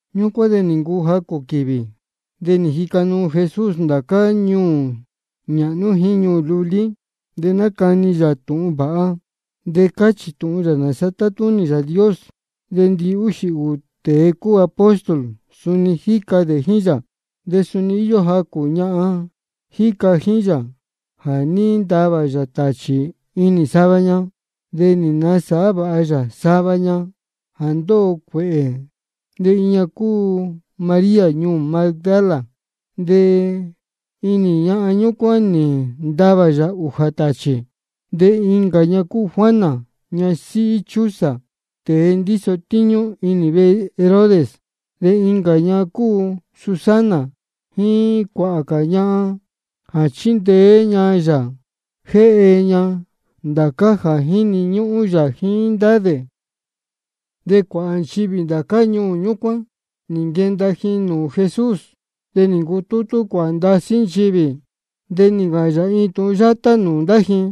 Ñúcuán de nī ncuu jacū quīvī, de nī jica nuu Jesús ndācá ñuū nāhnú jíín ñuū lulí. De nácani yā tūhun vāha, de cáchī yā nāsa tátúnī Yāā Dios. De ndihúxī ūū tēe cúu apóstol, suni jíca dē jíín yā. De suni íyó jacū ñahan jíca jíín yā, jā ní ntavā yā tāchī inī sava ña, de nī nasāhá vāha yā sava ña jā ndóho cuēhē. De iin ña cúu María ñuū Magdala, de inī ñahan ñúcuán nī ntavā yā ūjā tāchī. De incā ña cúu Juana, ñasíhí Chuza, tēe ndíso tíñú inī vehe Herodes. De incā ña cúu Susana, jíín cuāhā cā ñahan jā chíndeé ña yā jéhe ña ndācá jā jíni ñúhún yā jíín ndá dē. De cuāhā nchivī ndācá ñuū ñúcuán nī nquenda ji nūū Jesús. De nī ncutútú cuāhā ndasí nchivī, de nī ncāhān yā iin tūhun yátá nūū ndá ji: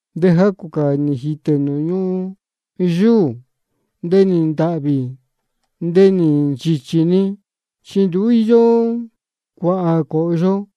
De jacū cā nī jītē nūū ñuhun yúū. De nī ntāhvī, de nī nchīchī-ni, chi nduú íyó cuāhā cōhyo.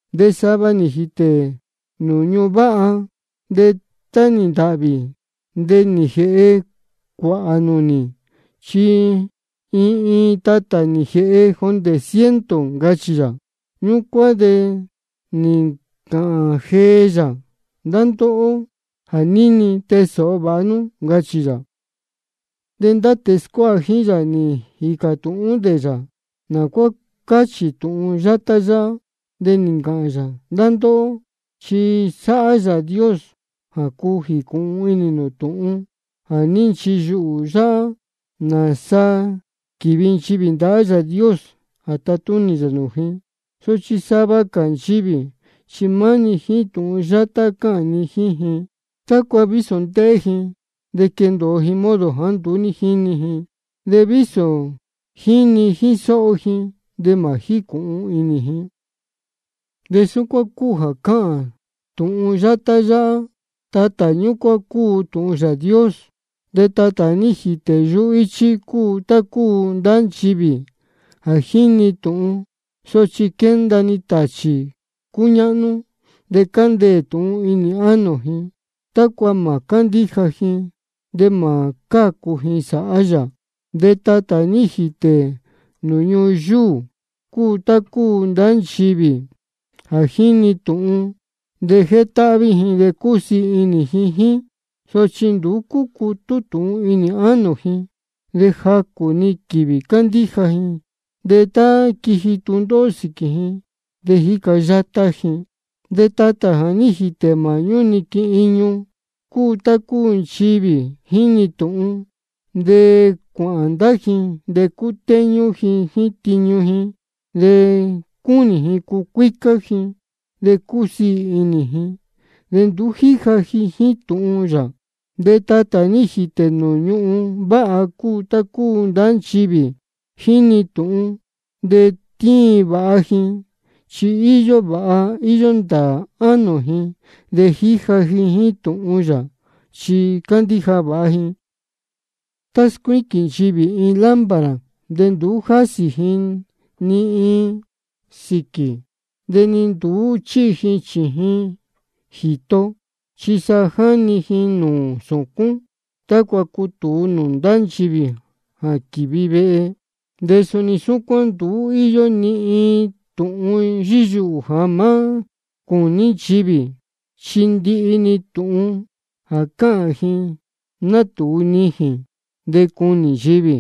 De sava nī jītē nūū ñuhun váha. De tá nī ntāhvī, de nī jēhe cuāhā nūnī, chi iin iin tatā nī jēhe jondē ciento, ncachī yā. Ñúcuán de nī ncāhān jee yā: Ndá ndóhó jā níni, tee sōho vāha nú, ncachī yā. De ndá tēe scuáha jíín yā nī jīcā tūhún dē yā nā cuá cáchī tūhun yátá yáhá. De nī ncāhān yā: Ndá ndóhó, chi sáhá Yāā Dios jā cuu jīcūhun inī nū tūhun jā ní nchiyuhū yáhá, nāsa quívi nchivī ndahá Yāā Dios jā tatúnī yā nūū ji. Sochi sava cā nchivī chi maá-ni jíín tūhun yátá cáhān ni jíín ji, tácua vísō ndéhé ji de quéndōo ji modo jāá nduú jínī ji. De vísō jíni jíín sóho ji, de mā jícūhun inī ji. De súcuán cúu jā cáhān tūhun yátá yáhá: Tatā ñúcuán cúu tūhun Yāā Dios. De tatā jā ní jītē yuhú íchí cúu tá cúu ndá nchivī jā jíni tūhun, sochi quénda-ni tāchī cúñáhnú, de cándeē tūhun inī ánō ji, tácua mā cándíja ji de mā cácu ji sāhá yā. De tatā jā ní jītē nūū ñuhun yúū cúu tá cúu ndá nchivī jā jíni tūhun, de jétáhví ji de cúsiī inī ji jíín. Sochi nduú cúcutú tūhun inī ánō ji, de jacū-ni quīvī cándíja ji. De tá quiji tūndóhó sīquī ji, de jíca yátá ji. De tatā jā ní jītē māhñú niquin iñu cúu tá cúu nchivī jíni tūhun, de cuāhān ndá ji de cútéñú ji jíín tiñu ji de cúnī ji cucuícá ji de cusiī inī ji. De nduú jíja ji jíín tūhun yā. De tatā jā ní jītē nūū ñuhun váha cúu tá cúu ndá nchivī jíni tūhun, de tíin vāha ji, chi íyó vāha íyó ndāā ánō ji. De jíja ji jíín tūhun yā, chi cándíja vāha ji. Tá scuíquīn nchivī iin lámpara, de nduú jásī ji ni iin sīquī, de ni nduú chíhi ji chījin jīto. Chi sa jáni ji nūū sūcún, tácua cutūu nūū ndá nchivī jā quívi vehe. De suni súcuán, nduú íyó ni iin tūhun yíyuhū jā má cūní nchivī, chi ndihi-ni tūhun jā cáhān ji natūu nijīn de cunī nchivī.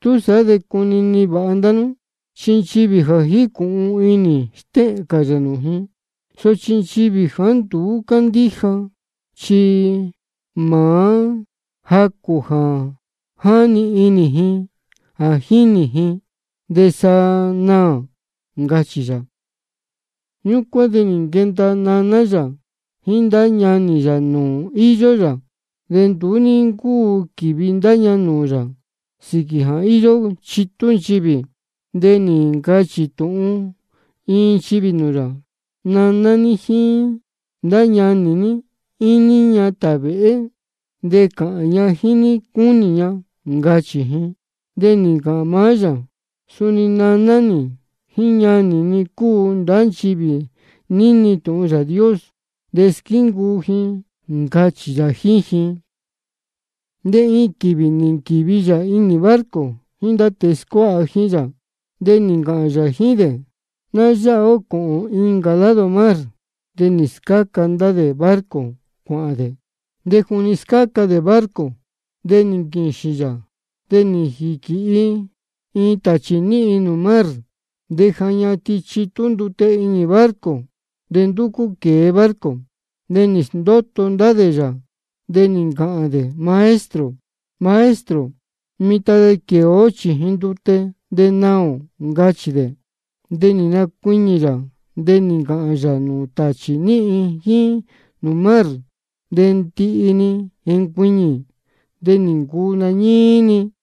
Túsaá de cunini vāha ndá nú, chi nchivī ja jícūhun inī, stéhēn cā yā nūū ji. Sochi nchivī jāá nduú cándíja, chi maá jacū jā jáni inī ji jā jínī ji, de sa naā, ncachī yā. Ñúcuán de nī nquenda naná yā jíín ndá ñanī yā nūū íyó yā. De nduú ní ncúu quīvi ndá ña nūū yā, sīquī jā íyó chitú nchivī. De nī ncachī tūhun iin nchivī nūū yā: Naná ní jíín ndá ñanī ní íñí ña tāvēhé, de cāhān ña jíín ní cúnī ña, ncachī ji. De nī ncāhān maá yā: Suni naná nī jíín ñanī ni cúu ndá nchivī níni tūhun Yāā Dios de squíncuu ji, ncachī yā jíín ji. De iin quīvī nī nquīvi yā iin barco jíín ndá tēe scuáha jíín yā, de nī ncāhān yā jíín dē: Ná yáha ó cōhōn incā lado mar. De nī scáca ndá dē barco cuāhān dē. De juni scáca dē barco de nī nquīxīn yā. De nī jīquīhi iin tāchī níhin nūū mar. De ja ñatin chitú ndute inī barco, de ndúcú quēe barco. De nī sndóto ndá dē yā, de nī ncāhān dē: Maestro, Maestro, mitan de quēe ó chījin ndute de naā ō, ncachī dē. De nī nacuiñī yā, de nī ncāhān yā nūū tāchī níhin jíín nūū mar. De ndihi nī jencuiñī, de nī ncuu nañíí-ni.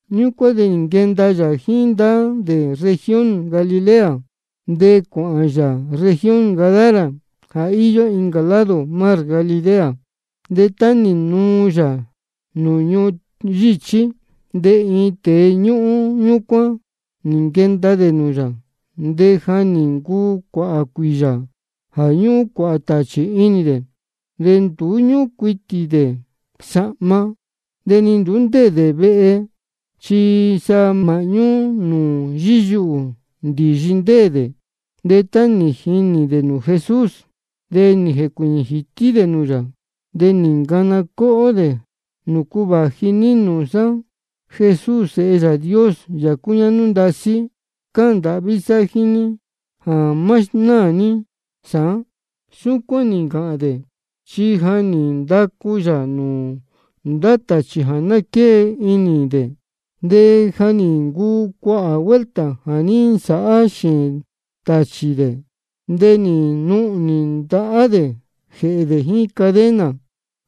Ñúcuán de nī nquenda yā jíín ndá dē región Galilea, de cuāhān yā región Gadara jā íyó incā lado mar Galilea. De tá nī nuu yā nūū ñuhun yíchí, de iin tēe ñuū ñúcuán nī nquenda dē nūū yā. De ja nī ncuu cuāhā cuīyā jā ñúhún cuāhā tāchī inī dē. De nduú ñúhún cuitī dē sahma, de ni nduú ndéē dē vehe, chi sa māhñú nūū yíyuhū ndīyi ndéē dē. De tá nī jinī dē nūū Jesús, de nī jēcuīñī jītí dē nūū yā, de nī ncana cóhó dē: ¿Nūcu vāji ní nūū sá, Jesús Sēhe Yāā Dios, Yāā cúñáhnú ndasí? Cáhān ndāhví sá jíín ní jā má sndóho ní sāán. Súcuán nī ncāhān dē, chi ja nī ndacu yā nūū ndá tāchī jā ná quée inī dē. De ja nī ncuu cuāhā vuelta jā ní nsāhá xēēn tāchī dē. De nī nuhnī ndahá dē jēhē dē jíín cadena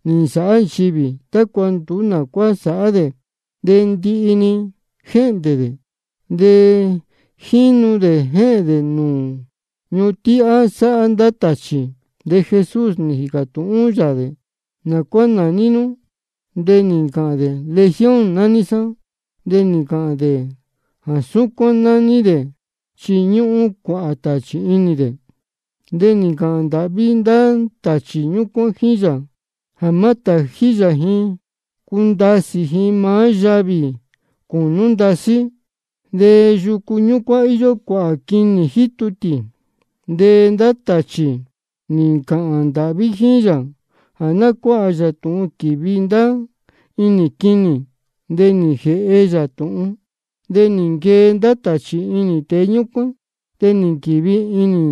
nī nsāhá nchivī, tácua nduú nā cuá sāhá dē. De ndihi-ni jéhndē dē, de jínu dē jéhēn dē nūū ñuhun tíhá sáhá ndá tāchī. De Jesús nī jīcā tūhún yā dē: ¿Nā cuá nāní nú? De nī ncāhān dē: Legión nání sá. De nī ncāhān dē jā súcuán nání dē, chi ñúhún cuāhā tāchī inī dē. De nī ncāhān ndāhví ndá tāchī ñúcuán jíín yā jā má tājí yā ji cundasī ji maá yavī cūnú ndasí. De yucu ñúcuán íyó cuāhā quinī jítu tī. De ndá tāchī nī ncāhān ndāhví jíín yā jā ná cuáha yā tūhun quīvi ndá inī quinī. De nī jēhe yā tūhun. De nī nquee ndá tāchī inī tēe ñúcuán, de nī nquīvi inī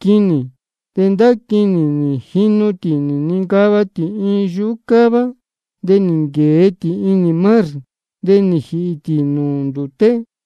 quinī. De ndá quinī nī jinu tī nī nincava tī iin yuhú cává, de nī nquēe tī inī mar, de nī jīhī tī nūū ndūté.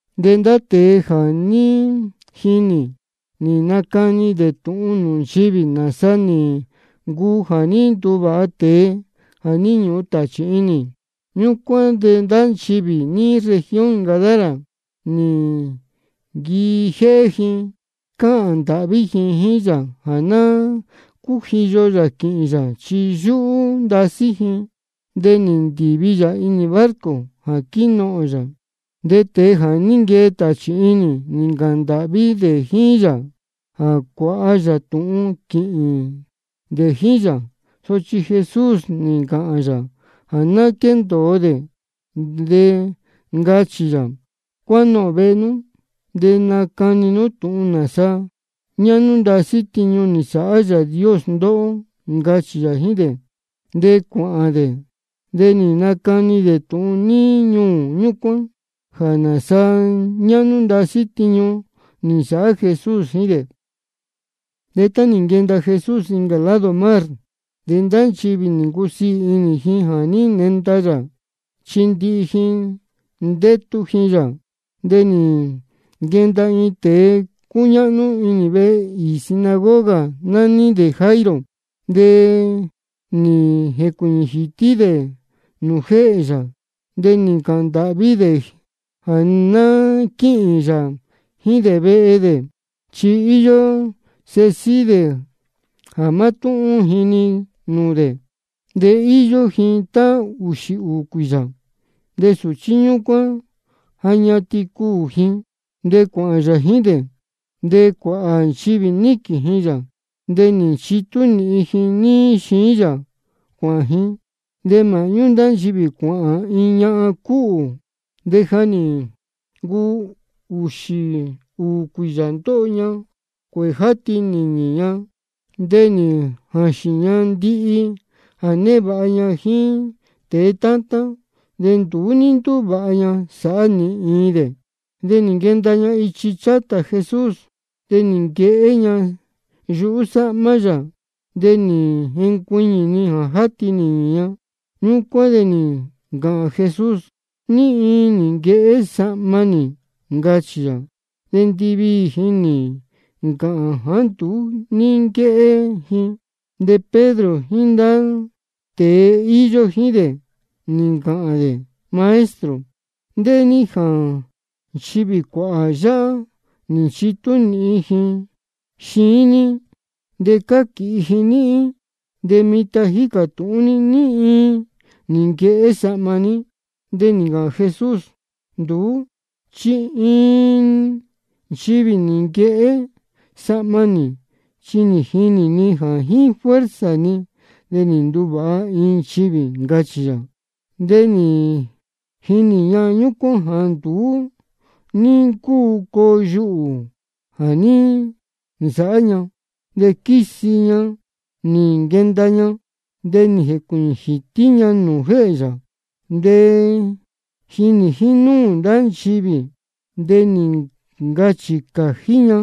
De ndá tēe jā ní jinī, nī nacani dē tūhun nūū nchivī, nāsa nī ncuu jā ní nduvāha tēe jā ní ñuhun tāchī inī. Ñúcuán de ndá nchivī níí región Gadara, nī nquijéhé ji cáhān ndāhví ji jíín yā jā ná cújiyo yā quīhīn yā, chi yúhú ndasí ji. De nī ndīvi yā inī barco jā quínohōn yā. De tēe jā ní nquee tāchī inī, nī ncāhān ndāhví dē jíín yā jā cuāha yā tūhun quīhīn dē jíín yā. Sochi Jesús nī ncāhān yā jā ná quéndōo dē, de ncachī yā: Cuánohōn vehe nú, de nacani nú tūhun nāsa ñáhnú ndasí tiñu nī nsāhá Yāā Dios ndóhó, ncachī yā jíín dē. De cuāhān dē, de nī nacani dē tūhun níí ñuū ñúcuán jā nāsa ñáhnú ndasí tiñu nī nsāhá Jesús jíín dē. De tá nī nenda Jesús incā lado mar, de ndá nchivī nī ncusiī inī ji jā ní nenda yā, chi ndihi ji ndétu ji yā. De nī nquenda iin tēe cúñáhnú inī vehe īī sinagoga, nání dē Jairo. De nī jēcuīñī jītí dē nūū jéhē yā, de nī ncāhān ndāhví dē jā ná quíhīn yā jíín dē vehe dē. Chi íyó iin sēhe síhí dē jā mátúhún ji-ni nūū dē, de íyó ji tá ūxī ūū cuīyā. De sūchí ñúcuán ja ñatin cuū ji. De cuāhān yā jíín dē, de cuāhā nchivī níquīn ji yā, de nī nchitú nīhin ji níí xiín yā cuāhān ji. De māhñú ndá nchivī cuāhān iin ñahan cúhū, de ja nī ncuu ūxī ūū cuīyā ndóho ña cuēhē játi nīñī ña. De nī jāxīn ña ndihi jā névāha ña jíín tēe tátán, de nduú ní ndúvāha ña sāhá ni iin dē. De nī nquenda ña ichi chátā Jesús, de nī nquehé ña yuhú sáhmá yā. De nī jencuiñī-ni jā játi nīñī ña. Ñúcuán de nī ncāhān Jesús: ¿Ní iin nī nquehé sahma nī? ncachī yā. De ndiviī ji nī ncāhān jāá nduú ní nquéhé ji. De Pedro jíín ndá tēe íyó jíín dē, nī ncāhān dē: Maestro, ndéhé ní jā nchivī cuāhā yáhá nī nchitú nīhin ji xiín ní, de cáquīhi ji níhín, de mitan jícā tūhún ní ní iin nī nquehé sahma ní. De nī ncāhān Jesús: Nduú chi iin nchivī nī nquehé sahma nī, chi nī jinī ni jā jíín fuerza ni de nī nduvāha iin nchivī, ncachī yā. De nī jinī ñahan ñúcuán jāá nduú ní ncúu coo yuhū jā ní nsāhá ña. De quísi ña nī nquenda ña, de nī jēcuīñī jītí ña nūū jéhē yā. De jínī jínúū ndá nchivī, de nī ncachī cājí ña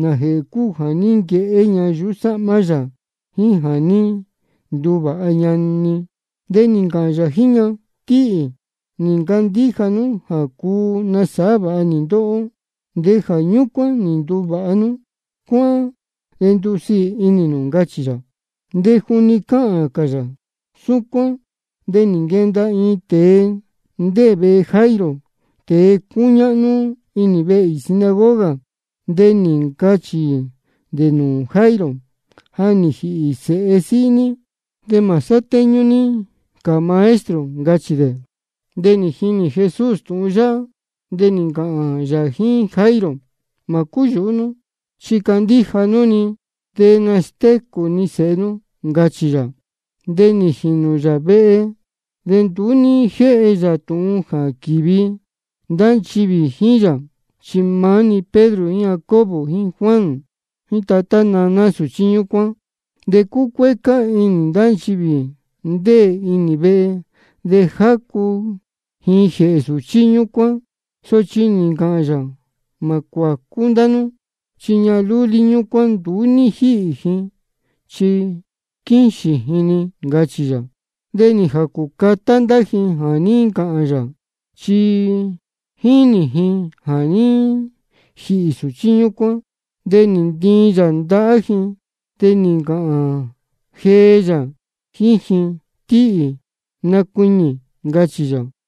nājēhē cúu jā ní nquehé ña yuhú sáhmá yā, jíín jā ní nduvāha ña-ni. De nī ncāhān yā jíín ña: Tíhī, nī ncandíja nú jā cuu nasāhá vāha nī ndóhó, de jā ñúcuán nī nduvāha nú. Cuáhán de ndusiī inī nū, ncachī yā. De juni cáhān cā yā súcuán, de nī nquenda iin tēe ndéē vehe Jairo, tēe cúñáhnú inī vehe īī sinagoga. De nī ncachī dē nūū Jairo: Ja nī jīhī sēhe síhí ní. De mā sátéñú ní cā Maestro, ncachī dē. De nī jini Jesús tūhun yáhá, de nī ncāhān yā jíín Jairo: Mā cúyūhú nú, chi candíja nú-ni, de nastécū ni sēhe nú, ncachī yā. De nī jīnū yā vehe, de nduú ní jéhe yā tūhun jā quīvi ndá nchivī jíín yā, chi maá-ni Pedro jíín Jacobo jíín Juan, jíín tatá naná sūchí ñúcuán. De cúcuécá inī ndá nchivī ndéē inī vehe, de jácu ji jēhē sūchí ñúcuán. Sochi nī ncāhān yā: Mā cuācú ndá nú. Chi ñahan lúlí ñúcuán nduú ní jíhī ji, chi quíxīn ji-ni, ncachī yā. De nī jācū catá ndá ji jā ní ncāhān yā, chi jínī ji jā ní jīhī sūchí ñúcuán. De nī ntiin yā ndahá ji, de nī ncāhān jee yā jíín ji: Tíhī, nacuiñī, ncachī yā.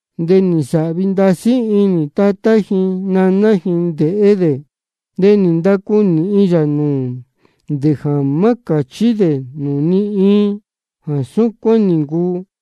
De nī nsāhvi ndasí inī tatá ji naná ji ndéhé dē. De nī ndacu nīhin yā nūū dē jā má cāchí dē nūū ni iin jā súcuán nī ncuu.